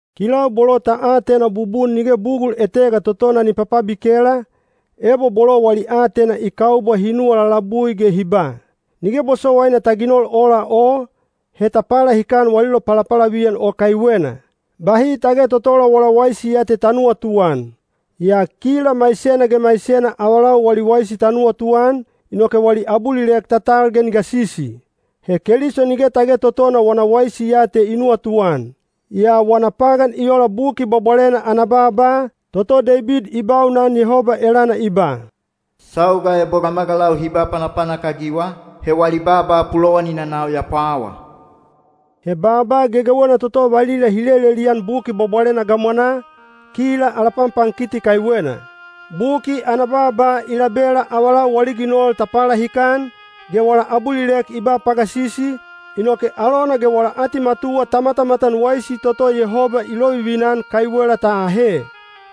Kilau bolo ta atena bubun nige bugul etega totona ni papabikela, ebo bolo wali aatena i kaubwa hi nuwa lalabui ge hi ba, “Nige bosowaina ta ginol ola o,” he ta palahikan wali lopalapalaviyan o kaiwena. Bahi tage totola wala waisi ya te ta nuwatuan. Yaa kila maisena ge maisena avalau wali waisi ta nuwatuan, inoke wali abulilek ta tal ge ni gasisi. He Keliso nige tage totona wana waisi ya te i nuwatuan. Yaa wana pagan i ola Buki Bwabwalena ana baaba, toto Deibid i baunan Yehoba elana i ba, “Sauga ebo gamagalau hi ba panapanak-agiwa, he wali baaba pulowanina nau ya pwawa.” He baaba gegewena toto valila hi lelelian Buki Bwabwalena gamwanaa, kila ala panpankiti kaiwena. Buki ana baaba i labela avalau wali ginol ta palahikan, ge wala abulilek i ba pagasisi, inoke alona ge wala atimatuwa ta matamatan waisi toto Yehoba i lovivina-an kaiwela ta ahe.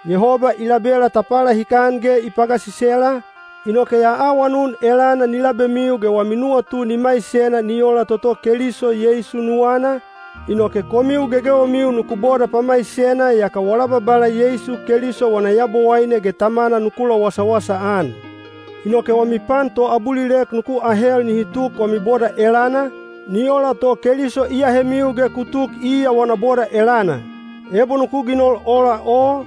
Yehoba i labela ta palahikan ge i pagasisela, inoke ya awanun elana ni labemiu ge wami nuwatu ni maisena ni ola toto Keliso Yeisu nuwana, inoke komiu gegewemiu nuku boda pamaisena yaka wala Babala Yeisu Keliso wana Yabowaine ge Tamana nuku lowasawasa-an. Inoke wami pan toabulilek nuku ahel nihi tuk wami boda elana, ni ola to Keliso i ahemiu ge ku tuk iya wana boda elana. Ebo nuku ginol ola o,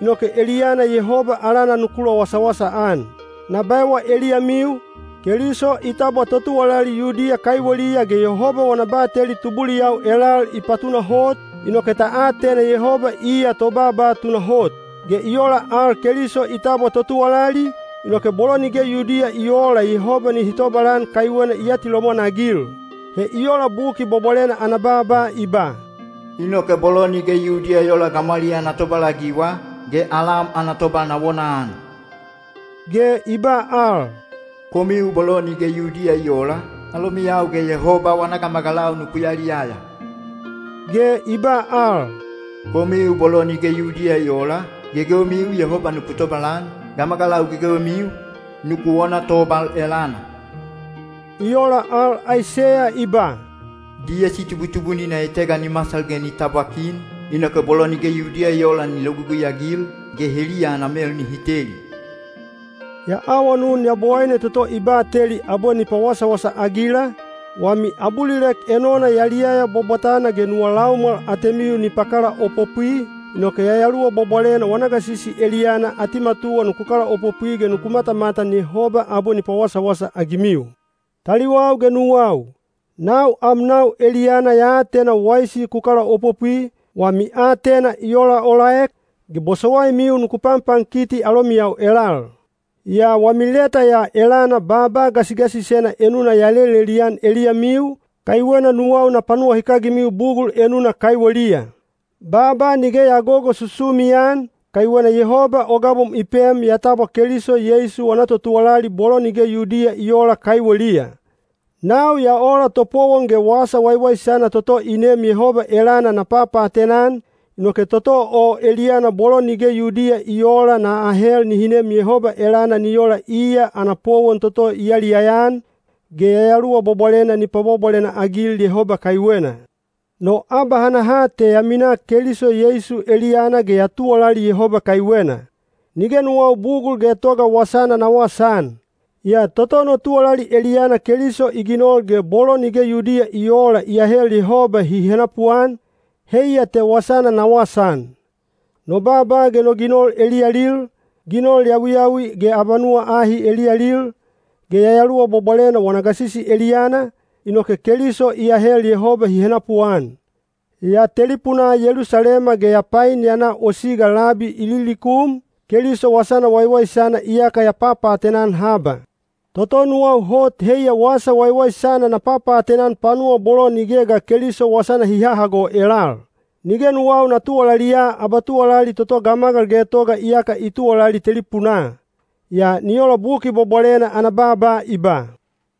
inoke eliyana Yehoba alana nuku lowasawasa-an. Na baewa eliyamiu, Keliso i tabwa totuwalali Yudiya kaiweliya ge Yehoba wana bateli tubuliyau elal i patunahot, inoke ta atena Yehoba iya tobaaba tunahot. Ge i ola al Keliso i tabwa totuwalali, inoke bolo nige Yudiya i oola Yehoba nihi tobalan kaiwena i atilomwan-agil. He i ola Buki Bwabwalena ana baaba i ba, “Inoke bolo nige Yudiya i oola gamwaliyaa na tobalagiwa, ge alam ana tobal na wonaan.” Ge i ba al, “Komiu bolo nige Yudiya i oola, alomiyau ge Yehoba wana gamagalau nuku yaliyaya.” Ge i ba al, “Komiu bolo nige Yudiya i oola, gegewemiu Yehoba nuku tobalan; gamagalau gegewemiu, nuku wona tobal elana.” I ola al Aiseya i ba, “Diyesi tubutubunina etega ni masal ge ni tabwa kin, inoke bolo nige Yudiya i oola ni logugui-agil, ge heliya ana mel nihi teli.” Ya awanun Yabowaine toto i bateli abwe ni pawasawasa-agila, wami abulilek enona yaliyaya bwabwatana ge nuwa laumwal atemiu ni pakalaopopwi, inoke Yayaluwa Bwabwalena wana gasisi eliyana atimatuwa nuku kalaopopwi ge nuku matamatan Yehoba abwe ni pawasawasa-agimiu. Taliwau ge nuwau, nau amnau eliyana ya atena waisi ku kalaopopwi, wami aatena i olaolaek, ge bosowaimiu nuku panpankiti alomiyau elal. Yaa wami leta ya elana baaba gasigasisena enuna ya lelelian eliyamiu, kaiwena nuwau na panuwahikagimiu bugul enuna kaiweliya. Baaba nige ya gogosusumi-an, kaiwena Yehoba o gabom i pem ya tabwa Keliso Yeisu wana totuwalali bolo nige Yudiya i oola kaiweliya. Nau ya ola topowon ge Wasa Waiwaisana toto i neem Yehoba elana na papaatena-an, inoke toto o eliyana bolo nige Yudiya i oola na ahel nihi nem Yehoba elana ni ola iya ana powon toto i yaliyaya-an, ge Yayaluwa Bwabwalena ni pwabwabwalena-agil Yehoba kaiwena. No abahanaha te ya minaa Keliso Yeisu eliyana ge ya tuwalali Yehoba kaiwena. Nige nuwau bugul getoga wasana na wasaan. Yaa toto no tuwalali eliyana Keliso i ginol ge bolo nige Yudiya i oola i ahel Yehoba hi henapuan, heiya te wasana na wasaan. No baaba ge no ginol eliyalil, ginol yawiyawi ge abanuwa ahi eliyalil, ge Yayaluwa Bwabwalena wana gasisi eliyana, inoke Keliso i ahel Yehoba hi henapuan. Ya telipunaa Yelusalema ge ya pain ya na o siga labi Ililikum, Keliso Wasana Waiwaisana iyaka ya papaatena-an haba. Toto nuwau hot heiya Wasa Waiwaisana na papaatena-an panuwa bolo nige ga Keliso wasana hi hahago elal. Nige nuwau na tuwalaliya abatuwalali toto gamagal getoga iyaka i tuwalali telipunaa. Yaa ni ola Buki Bwabwalena ana baaba i ba: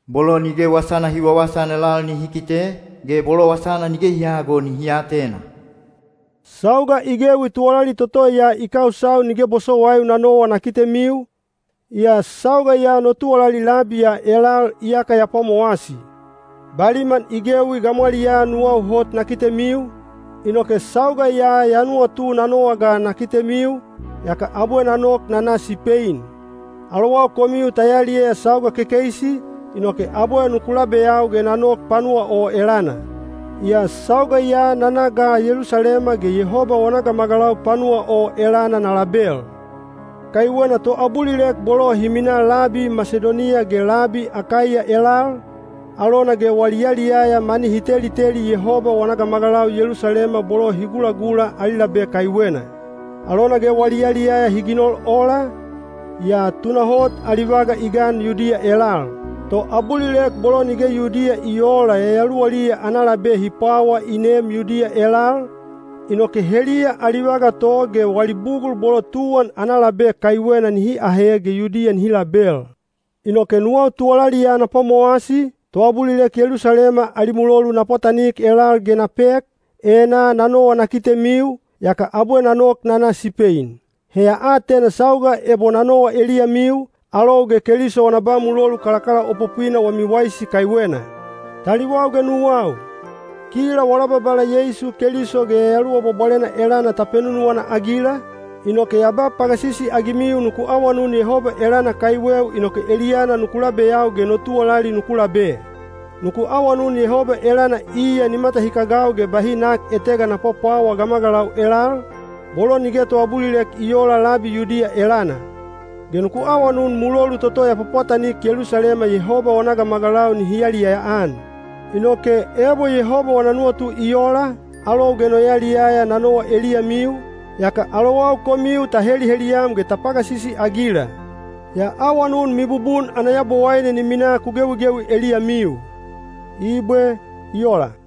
Bolo nige wasana hi wawasaan elal nihi kite, ge bolo wasana nige hi hahago nihi atena. Sauga i gewi tuwalali toto ya i kausau nige bosowaiu na nowa na kitemiu, yaa sauga ya no tuwalali labi ya elal iyaka ya pwamowasi. Baliman i gewi gamwaliyaa nuwau hot na kitemiu, inoke sauga ya ya nuwatu na nowa ga na kitemiu, yaka abwe na nok na na Sipein. Alowau komiu ta yaliyaya sauga kekeisi, inoke abwe nuku labeyau ge na nok panuwa o elana. Yaa sauga ya na na ga Yelusalema ge Yehoba wana gamagalau panuwa o elana na label. Kaiwena toabulilek bolo hi minaa labi Masidoniya ge labi Akaiya elal, alona ge wali yaliyaya mani hi teliteli Yehoba wana gamagalau Yelusalema bolo hi gulagula ali labe kaiwena. Alona ge wali yaliyaya hi ginol ola, yaa tunahot ali vaga i gan Yudiya elal. Toabulilek bolo nige Yudiya i oola yayaluwaliya ana labe hi pwawa i neem Yudiya elal, inoke heliya ali vaga to ge wali bugul bolo tuwan ana labe kaiwena nihi ahe ge Yudiya nihi label. Inoke nuwau tuwalali ya na pwamowasi, toabulilek Yelusalema ali mulolu na pwatanik elal ge na pek, enaa na nowa na kitemiu, yaka abwe na nok na na Sipein. He ya atena sauga ebo na nowa eliyamiu, alou ge Keliso wana ba mulolu kalakalaopopwina wami waisi kaiwena. Taliwau ge nuwau, kila wala Babala Yeisu Keliso ge Yayaluwa Bwabwalena elana ta penunuwana-agila, inoke ya ba pagasisi-agimiu nuku awanun Yehoba elana kaiweu inoke eliyana nuku labeyau ge no tuwalali nuku labe. Nuku awanun Yehoba elana iya ni matahikagau ge bahi nak etega na pwapwawa gamagalau elal, bolo nige toabulilek i oola labi Yudiya elana. Ge nuku awanun mulolu toto ya pwapwatanik Yelusalema Yehoba wana gamagalau nihi yaliyaya-an. Inoke, ebo Yehoba wana nuwatu i ola, alou ge no yaliyaya na nowa eliyamiu, yaka alowau komiu ta heliheliyam ge ta pagasisi-agila. Ya awanun mibubun ana Yabowaine ni minaa ku gewigewi eliyamiu. Ibwe. I ola.